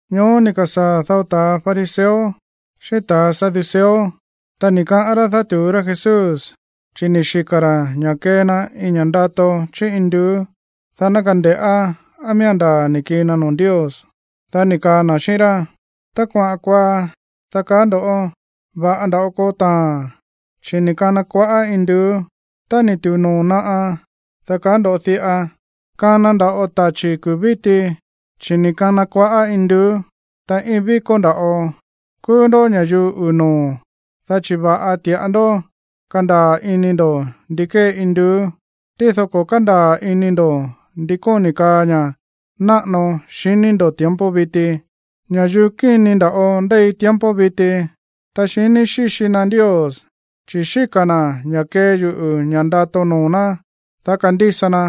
Ñoó ni̱ ka̱sáa̱ dao ta̱ fariseo xíꞌín ta̱ saduceo, ta ni̱ kaꞌán rá dátu̱ú rá Jesús, chi̱ ni̱ xika̱ ra̱ ña̱ kee na iin ña̱ꞌa ndato chí induú, dá ná kande̱ꞌá á miía̱n ndaa̱ ni̱ kii na noo̱ Ndios. Dá ni̱ kaa na̱ xíꞌín rá: ―Tá kuaꞌa̱n kuaá, dá kaá ndo̱: “Va̱ꞌa nda̱ꞌo koo taa̱n, chi̱ ni̱ kana kuaꞌá induú.” Tá ni̱ tu̱u noo̱ naꞌa, dá kaá ndo̱ diꞌa: “Kana nda̱ꞌo tachi̱ kuu̱ víti, chi̱ ni̱ kana kuaꞌá induú, ta íin víkó nda̱ꞌo.” ¡Kúú ndó ña̱yuu uu̱ noo̱, dá chi̱ va̱ꞌa ti̱ꞌa ndó kándaa̱ ini ndo̱ ndi kee induú, tído ko̱ kándaa̱ ini ndo̱ ndi kóni̱ kaa ña̱ náꞌano xiní ndo̱ tiempo viti! Ña̱yuu kíni nda̱ꞌo ndéi tiempo viti, ta xiní xíxi na Ndios, chi̱ xíka̱ na̱ ña̱ kee yuꞌu̱ ña̱ ndato noo̱ ná, dá kandísa na.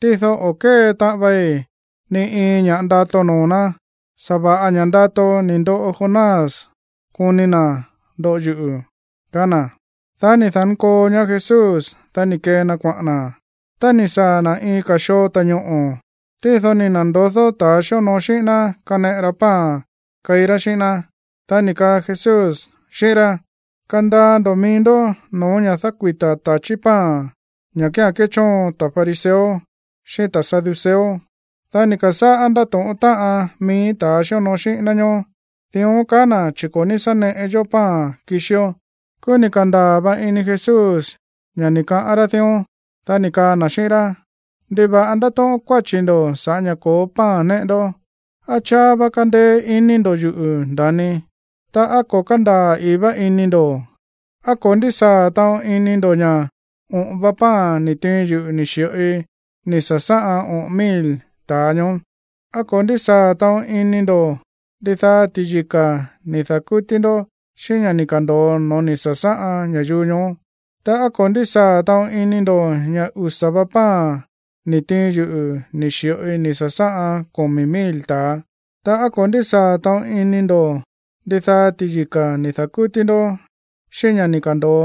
Tído o̱ kée taꞌan vai ni iin ña̱ ndato noo̱ ná. Sa̱va̱ꞌa ña̱ ndato ni̱ ndoꞌo Jonás koni na̱ ndoꞌo yuꞌu̱ ―kaá na̱. Dá ni̱ da̱nkoo ñaá Jesús, dá ni̱ kee na kuaꞌa̱n na̱. Ta ni̱ saa̱ na̱ iin ka̱ xoo ta̱ñoꞌo̱, tído ni̱ na̱ndodó ta̱ xíonoo xíꞌín ná kaneꞌe ra pan keí rá xíꞌín ná. Dá ni̱ kaa Jesús xíꞌín rá: ―Kandaa ndo̱ mií ndó no̱ó ña̱ dákuita̱ ta̱chí pan, ña̱ kía̱n kéchóon ta̱ fariseo xíꞌín ta̱ saduceo. Dá ni̱ ka̱sáꞌá ndátóꞌón táꞌan mií ta̱ xíonoo xíꞌín ná ñoó: ―Dión káꞌa̱n na̱, chi̱ ko̱ ní sá neꞌe yó pan kixió. Kúú ni̱ ka̱ndaa̱ va ini Jesús ña̱ ni̱ kaꞌa̱n ra̱ dión. Dá ni̱ kaa na̱ xíꞌín rá: ―¿Ndiva̱ꞌa ndátóꞌón kuáchi̱ ndo̱ sa̱ꞌá ña̱ ko̱ó pan néꞌe ndó? ¿Á cháá vá kándéé ini ndo̱ yuꞌu̱, nda̱ni? Ta, ¿á ko̱ kándaa̱ ii̱ vá ini ndo̱? ¿Á ko̱ ndísaa̱ taꞌon ini ndo̱ ña̱ oꞌo̱n va pan ni̱ tiin yuꞌu̱ ni̱ xi̱ꞌoi ni̱ sa̱sáꞌan oꞌo̱n mil ta̱a ñoó? ¿Á ko̱ ndísaa̱ taꞌon ini ndo̱ ndidaá ti̱yika̱ ni̱ da̱kútí ndó xíꞌín ña̱ ni̱ ka̱ndo̱o no̱ó ni̱ sa̱sáꞌan ña̱yuu ñoó? Ta, ¿á ko̱ ndísaa̱ taꞌon ini ndo̱ ña̱ usa̱ va pan ni̱ tiin yuꞌu̱ ni̱ xi̱ꞌoi ni̱ sa̱sáꞌan komi̱ mil ta̱a? Ta, ¿á ko̱ ndísaa̱ taꞌon ini ndo̱ ndidaá ti̱yika̱ ni̱ da̱kútí ndó xíꞌín ña̱ ni̱ ka̱ndo̱o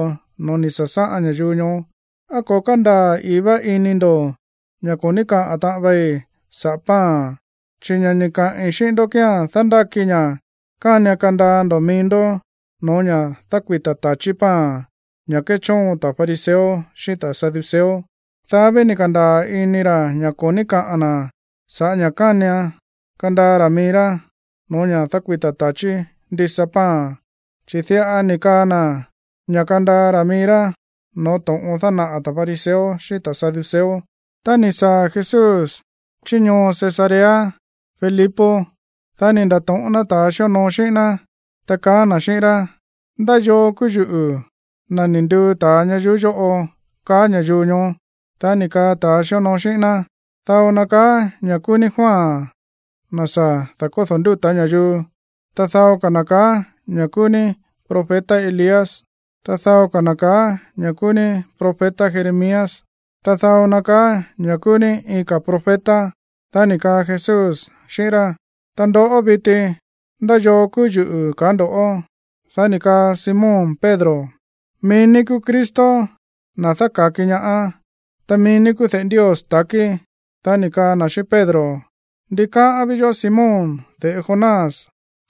no̱ó ni̱ sa̱sáꞌan ña̱yuu ñoó? ¿Á ko̱ kándaa̱ i̱í vá ini ndo̱ ña̱ ko̱ ní kaꞌa̱n taꞌon vei saꞌa̱ pan? Chi̱ ña̱ ni̱ kaꞌi̱n xíꞌín ndó kía̱n dándáki ña̱ kánian kandaa ndo̱ mií ndó no̱ó ña̱ dákuita̱ ta̱chí pan, ña̱ kéchóon ta̱ fariseo xíꞌín ta̱ saduceo. Dá ví ni̱ ka̱ndaa̱ ini ra̱ ña̱ ko̱ ní kaꞌa̱n na̱ sa̱ꞌá ña̱ kánian kandaa ra̱ mií rá no̱ó ña̱ dákuita̱ ta̱chí ndisa pan. Chi̱ diꞌa ni̱ kaꞌa̱n na̱ ña̱ kandaa ra̱ mií rá no̱ó to̱ꞌon dánaꞌa̱ ta̱ fariseo xíꞌín ta̱ saduceo. Tá ni̱ saa̱ Jesús chí ñoo Cesarea Filipo, dá ni̱ nda̱to̱ꞌón ná ta̱ xíonoo xíꞌín ná, ta kaá na̱ xíꞌín rá: ―¿Ndá yoo kúú yuꞌu̱, na̱ ni̱ nduu ta̱a ñayuú yóꞌo, kaá ña̱yuu ñoó? Dá ni̱ kaa ta̱a xíonoo xíꞌín ná: ―Dao na kaá ña̱ kúú ní Juan, na̱ sa̱ da̱kódo̱ ndúta̱ ña̱yuu. Ta dao ka̱ na̱ kaá ña̱ kúú ní profeta Elías. Ta dao ka̱ na̱ kaá ña̱ kúú ní profeta Jeremías. Ta dao na kaá ña̱ kúú ní iin ka̱ profeta. Dá ni̱ kaa Jesús xíꞌín rá: ―Ta ndoꞌó viti, ¿ndá yoo kúú yuꞌu̱, kaá ndo̱ꞌó? Dá ni̱ kaa Simón Pedro: ―Mií ní kúú Cristo, na̱ dáka̱ki ñaá. Ta mií ní kúú de̱ꞌe Ndios ta̱kí. Dá ni̱ kaa na̱ xíꞌín Pedro: ―Ndikáꞌán ví yoꞌó, Simón, de̱ꞌe Jonás,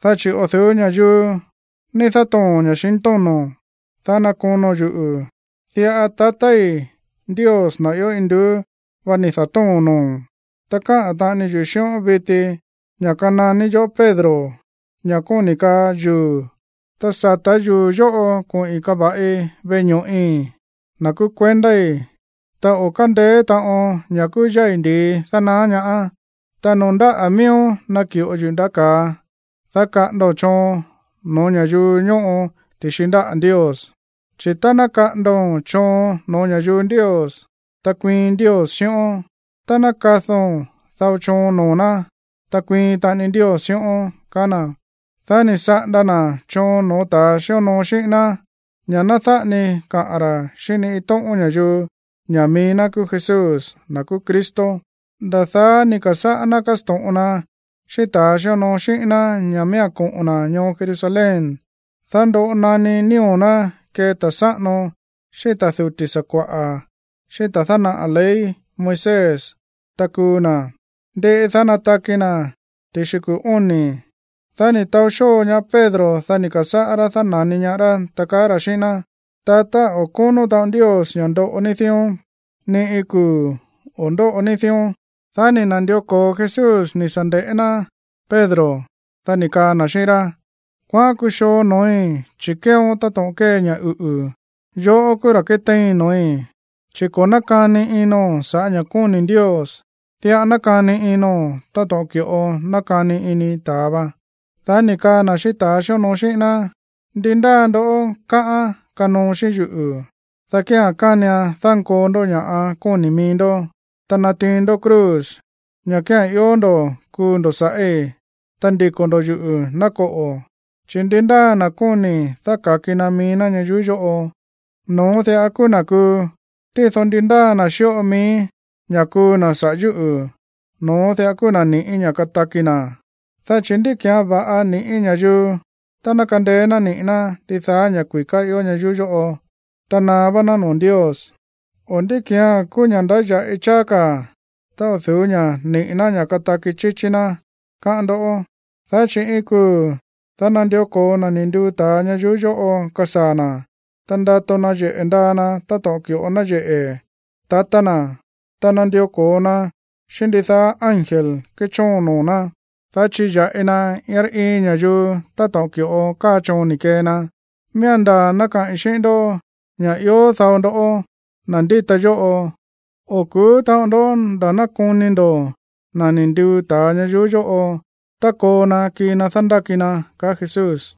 dá chi̱ o̱ du̱ú ña̱yuu ní dátoo̱n ña̱xintóno̱n, dá nákono̱n yuꞌu̱. Diꞌa tatái̱ Ndios, na̱ ió induú vá, ni̱ da̱tóo̱n noo̱o̱n. Ta káꞌa̱n taꞌani yuꞌu̱ xíꞌón viti ña̱ kananí yoꞌó Pedro, ña̱ kóni̱ kaa yuu̱, ta sa̱tá yuu̱ yóꞌo koꞌi̱n kava̱ꞌi veꞌe ño̱ꞌi̱, na̱ kúú kuendái̱, ta o̱ kándeé taꞌon ña̱ kúú yái̱ ndi̱i dánaá ñaáán. Ta noo̱ ndáꞌa̱ miíón naki̱ꞌo yuꞌu̱ ndaꞌá ka̱a, dá kaꞌa̱ndo̱n choon no̱ó ña̱yuu ñóꞌo ti̱xi ndáꞌa̱ Ndios. Chi̱ tá ná kaꞌa̱ndo̱n choon no̱ó ña̱yuu Ndios, ta kuiin Ndios xíꞌón. Tá ná kado̱n dao choon noo̱ ná, ta kuiin taꞌani Ndios xíꞌón ―kaá na̱. Dá ni̱ saꞌanda na̱ choon no̱ó ta̱ xíonoo xíꞌín ná ña̱ ná dáꞌa ni kaꞌa̱n ra̱ xíꞌín ni iin tóꞌón ña̱yuu ña̱ mií ná kúú Jesús, na̱ kúú Cristo. Nda̱ daá ni̱ ka̱sáꞌá ná kásto̱ꞌon na xíꞌín ta̱ xíonoo xíꞌín ná ña̱ miía̱n koꞌo̱n na̱ ñoo Jerusalén, dá ndoꞌo naní nío̱ ná kee ta̱ sáꞌano xíꞌín ta̱ duti̱ sakua̱ꞌa̱, xíꞌín ta̱ dánaꞌa̱ ley Moisés, ta kuu na̱. Ndiꞌi, dá nataki na̱ ti̱xi kuu̱ óni̱. Dá ni̱ taó xóo ñaá Pedro. Dá ni̱ ka̱sáꞌá rá dána̱ni ñaá rá, ta kaá ra̱ xíꞌín ná: ―Tatá, o̱ kónó taꞌon Ndios ña̱ ndoꞌo ní dión. ¡Ni iin kuu̱ o̱ ndóꞌo ní dión! Dá ni̱ na̱ndió ko̱o Jesús ni̱ sa̱ nde̱ꞌé ná Pedro. Dá ni̱ kaa na̱ xíꞌín rá: ―¡Kuaꞌán kuxoo no̱ói̱, chi̱ kéeón táto̱ꞌon kée ña̱ uꞌu̱! Yoꞌó kúú ra̱ kétéin no̱ói̱, chi̱ ko̱ nákani ino̱n sa̱ꞌá ña̱ kóni̱ Ndios, diꞌa nákani ino̱n táto̱ꞌon ki̱ꞌo nákani ini ta̱a va. Dá ni̱ kaa na̱ xíꞌín ta̱ xíonoo xíꞌín ná: ―Ndi ndáa ndo̱ꞌó káꞌán kanoo xíꞌín yuꞌu̱, dá kía̱n kánian dánkoo ndó ña̱ kóni̱ mií ndó, ta natiin ndó cruz, ña̱ kía̱n ió ndo̱ kuu ndo̱ sa̱ꞌí, ta ndiko̱ ndo̱ yuꞌu̱, ná koꞌo̱. Chi̱ ndi ndáa na̱ kóni̱ dáka̱ki na mií ná ñayuú yóꞌo, no̱ón diꞌa kúú na̱ kuu. Tído ndi ndaá na̱ xíꞌo mií ña̱ kuu na̱ saꞌa̱ yúꞌu̱, no̱ón diꞌa kúú na̱ ni̱ꞌí ña̱ kataki na̱. Dá chi̱, ¿ndí ki̱án va̱ꞌa ni̱ꞌí ña̱yuu tá ná kandeé ná niꞌi̱ ná ndidaá ña̱ kui̱ká ió ñayuú yóꞌo, ta naá vá ná noo̱ Ndios? O, ¿ndí ki̱án kúú ña̱ꞌa ndáya̱ꞌi cháá ka̱ tá o̱ du̱ú ña̱ niꞌi̱ ná ña̱ kataki chíchí ná, káꞌán ndó? Dá chi̱ iin kuu̱, dá nandió ko̱o na̱ ni̱ nduu ta̱a ñayuú yóꞌo kasaa̱ na̱, ta ndato nayeꞌe̱ ndaa na̱ táto̱ꞌon ki̱ꞌo náyeꞌe̱ tatá na̱, ta nandió ko̱o na xíꞌín ndidaá ángel kéchóon noo̱ ná, dá chiya̱ꞌi na iin rá iin ña̱yuu táto̱ꞌon ki̱ꞌo káa choon ni̱ kee na. Miía̱n ndaa̱ ná kaꞌi̱n xi̱ꞌín ndó ña̱ ió dao ndoꞌó, na̱ ndíta yóꞌo, o̱ ku̱ú taꞌon ndó nda̱ ná koni ndo̱ na̱ ni̱ nduu ta̱a ñayuú yóꞌo tá koo na kii na dándáki na ―kaá Jesús.